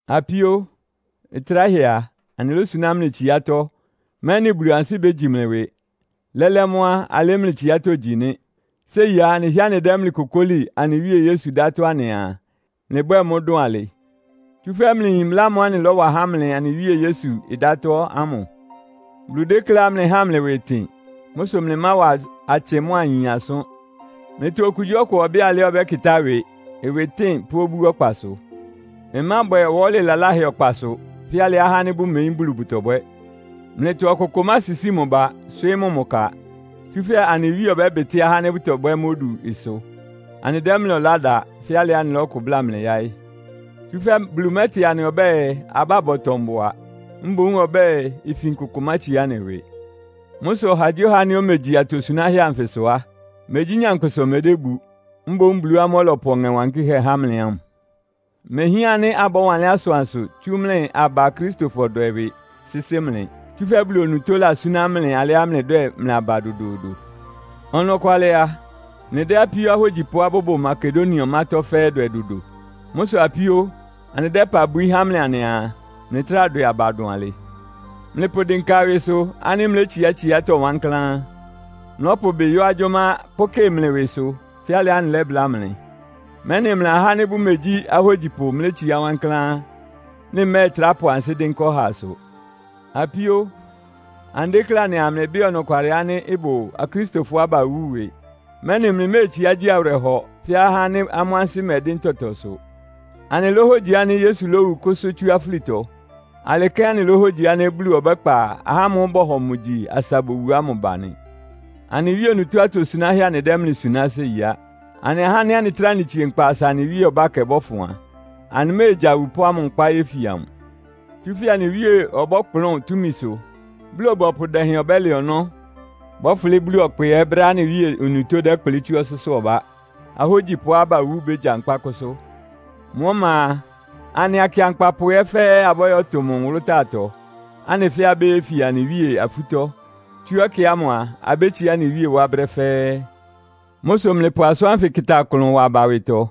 Apíó, ɩtráhɛ a, anɩlósuná mlɩ tsiátɔ́, mɛ́nɩ Bulu ansɩ́ bégyi mlɩ ɩwɩ. Lɛ́lɛ́ mʋ́ á, alɩ́ mlɩ tsiátɔ́ gyí nɩ́. Séi á, anɩhɩ́ɛ́ anɩdɛ́ mlɩ kokóli anɩ Wíe Yesu dátɔ́ anɩaa, mlɩbwɛ́ɛ mʋ́ dʋn alɩ. Tsúfɛ́ mlɩyin mbla ámʋ́ʋ́ anɩlɔ́wa há mlɩ anɩ Wíe Yesu ɩdátɔ́ ámʋ. Bulu dékléá mlɩháa mlɩ ɩwɩ ɩtɩn. Mʋ́ sʋ mlɩmáwa atsɩ mʋ́a ayin asʋ́n. Mlɩtɔ okugyíɔkʋ ɔbɩ́ɩ alɩá ɔbɛ́kɩtá ɩwɩ, ɩwɩtɩ́ɩn pʋ́ obú ɔkpasʋ. Ɩmábwɛ ɔwɔ́lɩ laláhɛ ɔkpasʋ, fɛ́ alɩá ahá ánɩ́ bʋmeyín Bulu bʋtɔbwɛ́. Mlɩtɔ ɔkʋkʋ másisíi mʋ ba, swɩ́ɩ́ mʋ mʋ ka. Tsúfɛ́ anɩ Wíe ɔbɛ́bɩtɩ́ ahá ánɩ́ bʋtɔbwɛ́ mʋ́ odu ɩsʋ. Anɩdɛ́ mlɩ ɔlá da, fɛ́ alɩá anɩlɔ́kʋ bláa mlɩ yáɩ́. Tsúfɛ́ Bulu mɛ́tɩ anɩ ɔbɛ́ɛ, abá bɔtɔ mbʋa; mboún ɔbɛ́ɛ, ifin kʋkʋ mátsiá anɩ ɩwɩ. Mʋ́ sʋ ɔhagyíɔha ánɩ́ omegyi atosunáhɛ́ anfɩsʋ á, megyí nyankpʋsa omédébu. Mboún Bulu ámʋ́ʋ́ ɔlɔpʋ mʋ Ɔŋɛ Wankɩ́hɛ́ há mlɩ ámʋ. Imehián ánɩ́ abɔ́wanlɩ́n asʋansʋ tsú mlɩ aba akristofɔ dwɛ ɩwɩ sɩ́sɩ́ mlɩ. Tsúfɛ́ Bulu onutó lasúná mlɩ alɩá mlɩdwɛ́ɛ mlɩ aba dodoodo. Ɔnɔkwalɩ a, mlɩdɛ́ apíó ahógyipʋá bʋbʋ Makedonia ɔmátɔ́ fɛ́ɛ́ dwɛ dodo. Mʋ́ sʋ apíó, anɩdɛ́ ɩpa bwií há mlɩ anɩaa, mlɩtráa dwɛ aba dʋn alɩ. Mlɩpʋdɩnka ɩwɩsʋ ánɩ́ mlétsiá tsiátɔ́ wankláán. Mlɔ́pʋ mlɩ ɩbɩ yɔ́ agyʋ́má pʋ́kɩ mlɩ ɩwɩsʋ, fɛ́ alɩá anɩlɛ́bláa mlɩ, mɛ́nɩ mlɩa ahá ánɩ́ bʋmegyí ahógyipʋ mlétsiá wankláán, mlɩmɛ́ɛtrá pʋ ansɩ́ dɩ́nká ɔhaasʋ. Apíó, anɩdéklé anɩaa mlɩbɩ́ɩ ɔnɔkwalɩ ánɩ́ ɩbʋ Akristofɔá bawú ɩwɩ, mɛ́nɩ mlɩméetsiá gyi awɩrɛhɔ fɛ́ ahá ánɩ́ amʋ́ ansɩ́ mɛdɩ́n tɔtɔsʋ. Anɩlóhogyi ánɩ́ Yesu lówu kʋ́sʋ́ tsú afúlitɔ. Alɩ kɛ́n anɩlóhogyi ánɩ́ Bulu ɔbɛ́kpa ahá ámʋ́ʋ́ bɔhɔ mʋ gyi asa bowu ámʋ ba nɩ. Anɩ Wíe onutó atosunáhɛ́ anɩdɛ́ mlɩ suná séi á. Anɩ ahá ánɩ́ anɩtráa anɩtsie nkpa asa anɩ Wíe ɔbákɛ ɩbɔ́fʋn a, anɩméegya awupʋ́ ámʋ nkpá yéfia mʋ. Tsúfɛ́ anɩ Wíe ɔbɔ́kplʋ́n túmisʋ, Bulu-ɔbɔpʋ dɛhɛn ɔbɛ́lɛ ɔnɔ́, bɔ́fʋlɩ́ Bulu ɔkpɛ ɛ́ brɛ́á anɩ Wíe onutó dɛ́kplɩ́ tsú ɔsʋ́sʋ́ ɔbá. Ahógyipʋá bawú bégyankpá kʋ́sʋ́. Mʋ ɔma a, anɩ akɩankpapʋ ɛ́ fɛ́ɛ́ abɔ́yɔ́tʋ amʋ́ nwʋlʋ́táatɔ, anɩ fɛ́ɛ́ abéyefia anɩ Wíe afútɔ́. Tsú ɛkɛ ámʋ a, abétsiá anɩ Wíe wá brɛ́ fɛ́ɛ́. Mʋ́ sʋ mlɩpʋ asʋ́n ánfɩ kɩta ɩklʋn wa aba ɩwɩtɔ.